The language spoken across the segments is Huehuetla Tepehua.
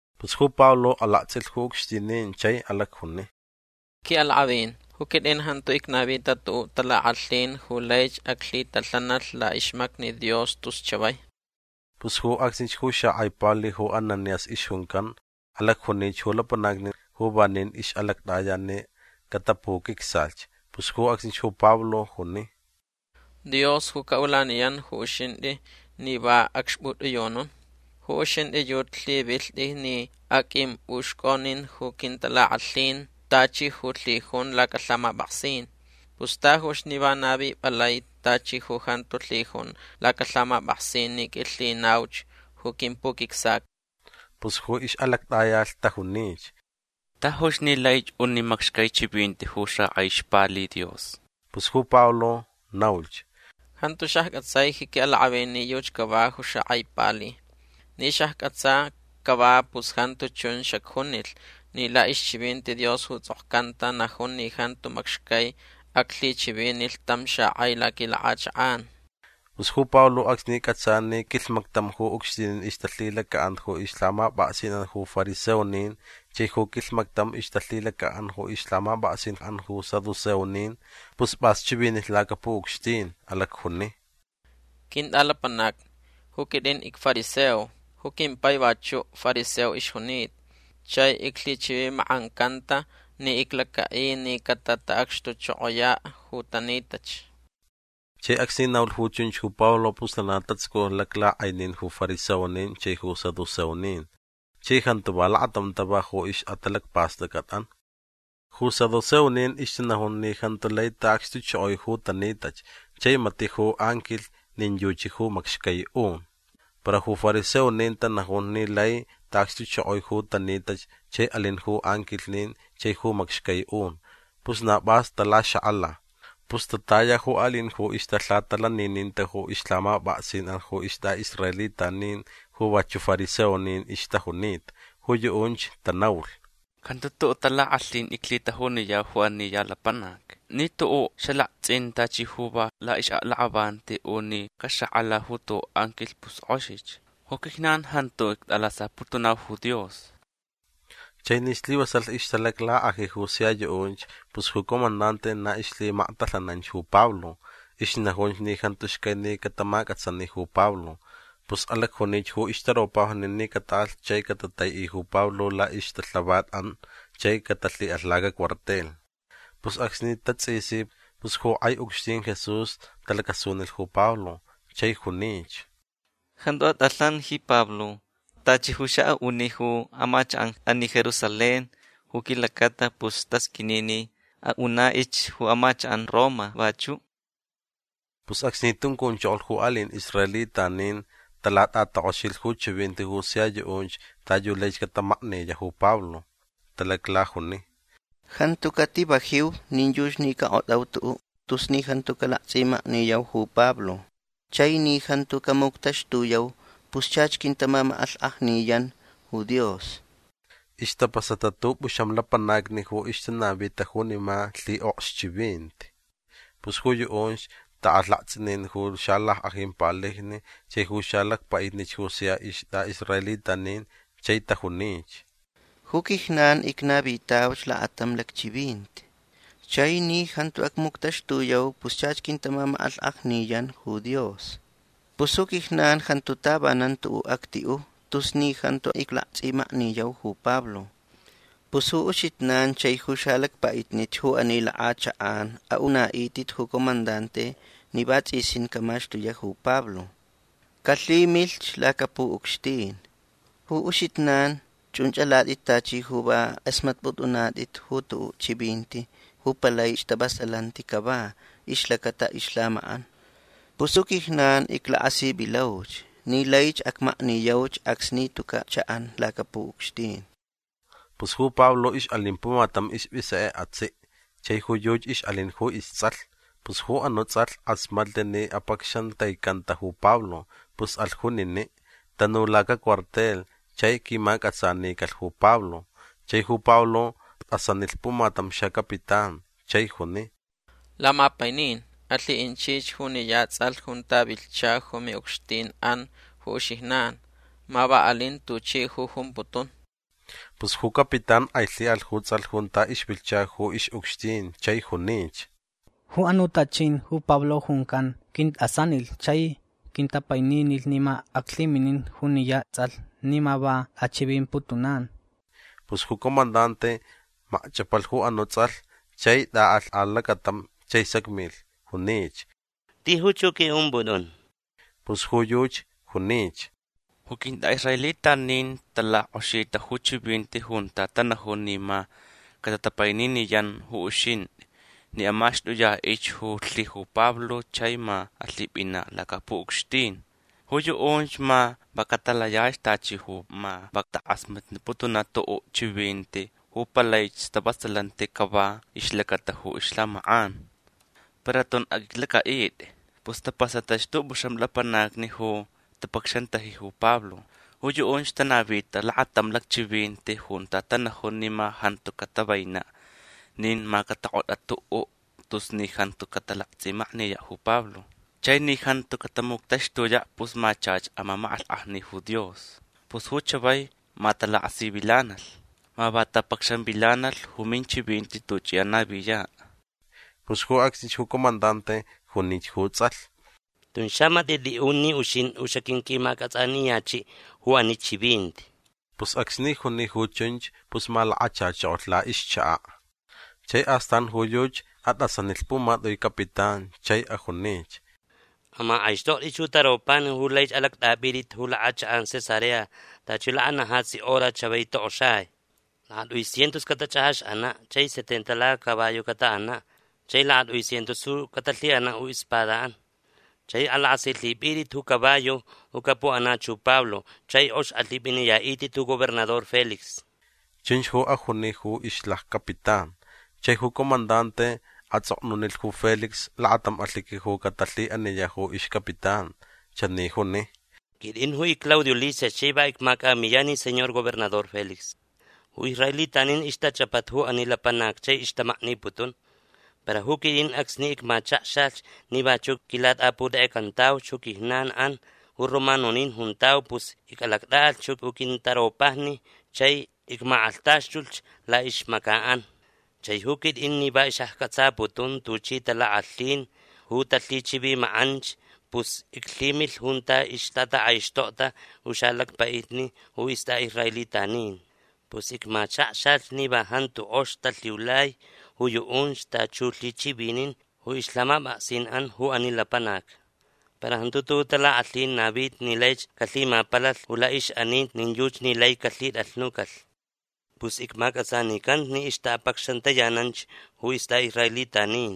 Pus ju Pablo alaktsʼilh ju ucxtinin chai alacjuni: ―Quiʼalakʼavin ju quitʼin jantu icnavita tuʼuʼ talakʼalhin ju laich aclhitalhanalh laʼixmacni Dios tus chavai. Pus ju acsnich ju xakʼai pali ju Ananías ixjuncan alacjunich ju lapanacni ju vanin ixʼalactʼaya ni catapuquicsalhch. Pus ju acsnich ju Pablo juni: ―Dios ju caʼulaniyan ju uxintʼi ni va acxpʼutʼiyunun. Ju uxintʼi yuchi lhivilhtʼi ni aqʼuimpʼuxcʼonin ju quintalakʼalhin tachi ju lhijun lacalhamapʼaksin. Pus tajuch ni va navipʼalai tachi ju jantu lhijun lacalhamapʼaksin ni qʼuilhinauch ju quimpuquicsaca. Pus ju ixʼalactʼayalh tajunich: ―Tajuch ni laich uni macxcai chivinti ju xakʼai ixpali Dios. Pus ju Pablo naulhch: ―Jantu xaccʼatsai ji quiʼalakʼavin ni yuchi cava ju xakʼai pali. Ni xaccʼatsa cava pus jantu chun xacjunilh ni laʼixchivinti Dios ju tsʼokcanta najun ni jantu macxcai aclhichivinilh tam xakʼai laquilakʼachakʼan. Pus ju Pablo acsni cʼatsa ni quilhmactam ju ucxtinin ixtalhilacaʼan ju ixlhamapʼaksinʼan ju fariseonin chai ju quilhmactam ixtalhilacaʼan ju ixlhamapʼaksinʼan ju saduceonin pus pʼas chivinilh lacapuʼucxtin. Alacjuni: ―Quintʼalapanacni ju quitʼin icfariseo. Ju quimpai vachuʼ fariseo ixjunita. Chai iclhichivimakʼancanta ni iclacaʼi ni catataʼacxtuchokoyaʼ ju tanitach. Chai acsni naulh ju chunch ju Pablo pus lana tatsuculh laklakʼainin ju fariseonin chai ju saduceonin. Chai jantu va lakatam tava ju ixʼatalacpastʼacʼatʼan. Ju saduceonin ixtanajun ni jantu lai taʼacxtuchokoi ju tanitach chai matiʼ ju anquilh nin yuchi ju macxcai un. Para ju fariseonin tanajun ni lai taʼacxtuchokoi ju tanitach chai alin ju anquilhnin chai ju macxcai un. Pus na pʼas talaxakʼala. Pus tataya ju aliʼin ju na ixtalhaʼatalanininta ju ixlhamapʼaksinʼan ju istʼaʼisraelitanin ju vachuʼ fariseonin ixtajunita. Ju yuʼunch tanaulh: ―Jantu tuʼuʼ talakʼalhin iclhitajuniyau ju ani ya lapanac. Ni tuʼuʼ xalaktsʼin tachi ju va laʼixʼaklakʼavanti u ni caxakʼala ju tuʼuʼ anquilh pus kʼoxich. Ju quijnan jantu ictʼalasaputunau ju Dios. Chai ni slivasalh ixtalaclakʼaji ju sia yuʼunch pus ju comandante na ixlhimaktalhananch ju Pablo. Ixnajunch ni jantu xcai ni catamacʼatsani ju Pablo. Pus alacjunich ju ixtaropajni ni cataʼalh chai catataiʼi ju Pablo laʼixtalhavatʼan chai catalhiʼalh lacacuartel. Pus acsni tatsʼisi pus ju kʼai ucxtin Jesús talacasunilh ju Pablo chai junich: ―Jantu atʼalhan ji Pablo. Tachi ju xaʼaʼuni ju amachakʼan ani Jerusalén ju quilacata pus tasqʼuini ni aʼunaʼich ju amachakʼan Roma vachuʼ. Pus acsni tuncunchokolh ju aliʼin israelitanin talatʼatakʼoxilh ju chivinti ju sia yuʼunch ta yu laich catamakniyaʼ ju Pablo. Talaclajuni: ―Jantu cativajiu nin yuchi ni cakʼotʼau tuʼuʼ tus ni jantu calaktsʼimakniyau ju Pablo. Chai ni jantu camuctaxtuyau pus chach quintamamakʼalhkʼajniyan ju Dios. Istapasata tʼupʼuxam lapanacni ju ixtanavita junima lhiʼokxchivinti. Pus ju yuʼunch taʼalh laktsʼinin ju xalackʼajin palijni chai ju xalacpaʼitnich ju sia istʼaʼisraelitanin chai tajunich: ―Ju quijnan icnavitauch lakatam lacchivinti. Chai ni jantu acmuctaxtuyau pus chach quintamamakʼalhkʼajniyan ju Dios. Pus ju quijnan jantu tavanan tuʼuʼ actiʼu tus ni jantu iclaktsʼimakniyau ju Pablo. Pus ju uxijnan chai ju xalacpaʼitnich ju ani lakʼachakʼan aʼunaʼitʼit ju comandante ni vatsʼisin camaxtuyaʼ ju Pablo. Calhimilh lacapuʼucxtin. Ju uxijnan chunch alatʼit tachi ju va kʼasmatnipʼutʼunatʼit ju tuʼuʼ chivinti ju palai stavasalanti cava ixlacata ixlhamakʼan. Pus ju quijnan iclakasivilauch ni laich acmakniyauch acsni tucaʼ chaʼan lacapuʼucxtin. Pus ju Pablo ixʼalin pumatam ispʼisekʼe atsiʼ. Chai ju yuchi ixʼalin ju istsʼalh. Pus ju anuʼ tsʼalh kʼasmatlh ni apacxantaicanta ju Pablo. Pus alh juniniʼ. Tanu lacacuartel chai quimacʼatsanicalh ju Pablo. Chai ju Pablo tʼasanilh pumatam xacapitán chai juni: ―Lamapainin alhiʼinchich juniya tsʼalh junta vilhcha ju miʼucxtinʼan ju uxijnan. Ma va alin tuchi ju jumputun. Pus ju capitán kʼailhiʼalh ju tsʼalh junta ixvilhcha ju ixʼucxtin chai junich: ―Ju anuʼ tachʼin ju Pablo juncan quintʼasanilh chai quintapaininilh ni ma aclhiminin juniya tsʼalh ni ma va tʼachivimputunan. Pus ju comandante makchʼapalh ju anuʼ tsʼalh chai tʼaʼalh alacatam chai sacmilh. Junich: ―Tijuch ju qʼuiʼumpʼutʼun. Pus ju yuchi junich: ―Ju quintʼaʼisraelitanin talakʼoxita ju chivinti junta tanajun ni ma catatapaininiyan ju uxintʼi ni amaxtʼuyaʼich ju lhi ju Pablo chai ma alhipʼinaʼ lacapuʼucxtin. Ju yuʼunch ma va catalayach tachi ju ma va takʼasmatniputunch tuʼuʼ chivinti ju palai stavasalanti cava ixlacata ju ixlhamakʼan. Para tun aqʼuiclacʼaʼitʼi. Pus tapasatach tʼupʼuxam lapanacni ju tapacxantaji ju Pablo. Ju yuʼunch tanavita lakatam lacchivinti junta tanajun ni ma jantu catavainaʼ nin ma catakʼotʼaʼ tuʼuʼ tus ni jantu catalaktsʼimakniyaʼ ju Pablo. Chai ni jantu catamuctaxtuyaʼ pus ma chach amamakʼalhkʼajni ju Dios. Pus ju chavai ma talakasivilanalh. Ma va tapacxanvilanalh ju minchivinti tuchʼi anaviyaʼ. Pus ju acsnich ju comandante junich ju tsʼalh: ―Tun xamatiʼ tʼiʼun ni uxintʼi ju xaqʼuinqʼuimacʼatsʼaniyachiʼ ju ani chivinti. Pus acsni juni ju chunch pus malakachachokolh laʼixchakaʼ. Chai astan ju yuchi atʼasanilh pumatʼui capitán chai ajunich: ―Amakʼaixtʼoktʼit ju taropajni ju laich alactʼapʼitʼit ju lakʼachakʼan Cesarea tachi lakanajatsi hora chavai tokʼoxai. Lakatʼui cientos catachʼajaxʼanaʼ chai setenta lacacaballo cataʼanaʼ chai lakatʼui cientos ju catalhiʼanaʼ ju ispadaʼan. Chai alakʼasilhipʼinitʼit ju caballo ju capuʼanach ju Pablo chai kʼox alhipʼiniyaʼitʼit ju gobernador Félix. ―Chunch ju ajuni ju ixlaccapitán. Chai ju comandante atsʼoknunilh ju Félix lakatam alhiqui ju catalhiʼaniyaʼ ju ixcapitán. Chani juni: “Quitʼin ju icClaudio Lisias chai va icmacʼamiyan ji señor gobernador Félix. Ju israelitanin ixtachʼapata ju ani lapanac chai ixtamakniputun. Para ju quitʼin acsni icmachakxalh ni vachuʼ quilatʼaputekʼecantauch ju quijnanʼan ju romanonin juntau pus icʼalactʼaʼalh ju quintaropajni chai icmakʼalhtaxtulh laʼixmacaʼan. Chai ju quitʼin ni va xaccʼatsaputun tuchi talakʼalhin ju talhichivimakʼanch pus iclhimilh junta ixtatakʼaixtokta ju xalacpaʼitni ju istʼaʼisraelitanin. Pus icmachakxalh ni va jantu kʼox talhiulai ju yuʼunch tachi ju lhichivinin ju ixlhamapʼaksinʼan ju ani lapanac. Para jantu tuʼuʼ talakʼalhin navita ni laich calhimapalalh ju laʼixʼaninti nin yuchi ni lai calhitʼalhnucalh. Pus icmacʼatsanicanta ni ixtaʼapacxantayananch ju istʼaʼisraelitanin.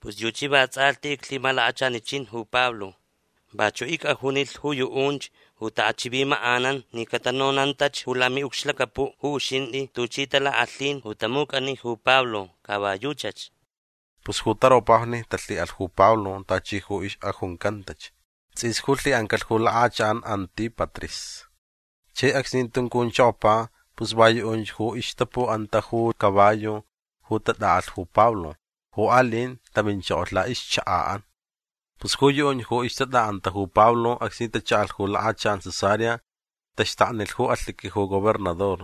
Pus yuchi vatsʼalhti iclhimalakachanichin ju Pablo. Vachuʼ icʼajunilh ju yuʼunch ju taʼachivimakʼanan ni catanonantach ju lamiʼucxlacapuʼ ju uxintʼi tuchi talakʼalhin ju tamucʼani ju Pablo. Ca va yuchach”. Pus ju taropajni talhiʼalh ju Pablo tachi ju ixʼajuncantach. Tsʼis ju lhiʼancalh ju lakʼachakʼan Antípatris. Chai acsni tuncunchokopa pus va yuʼunch ju ixtapuʼanta ju caballo ju tatʼaʼalh ju Pablo. Ju aliʼin taminchokolh laʼixchakaʼan. Pus ju yuʼunch ju ixtatʼaʼanta ju Pablo acsni tachaʼalh ju lakʼachakʼan Cesarea taxtaknilh ju alhiqui ju gobernador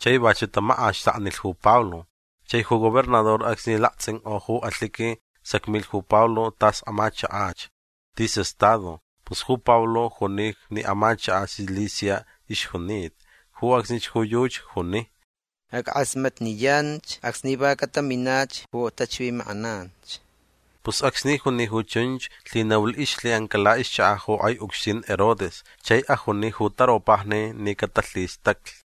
chai vachuʼ tamakʼaxtaknilh ju Pablo. Chai ju gobernador acsni laktsʼinkʼo ju alhiqui sacmilh ju Pablo tas amachakach. Tis estado. Pus ju Pablo juni ni amachakaʼ Cilicia ixjunita. Ju acsnich ju yuchi juni: ―Ackʼasmatniyanch acsni va cataminach ju tachivimakʼananch. Pus acsni juni ju chunch lhinaulh ixlhiʼanca laʼixchakaʼ ju kʼai ucxtin Herodes chai ajuni ju taropajni ni catalhistaclh.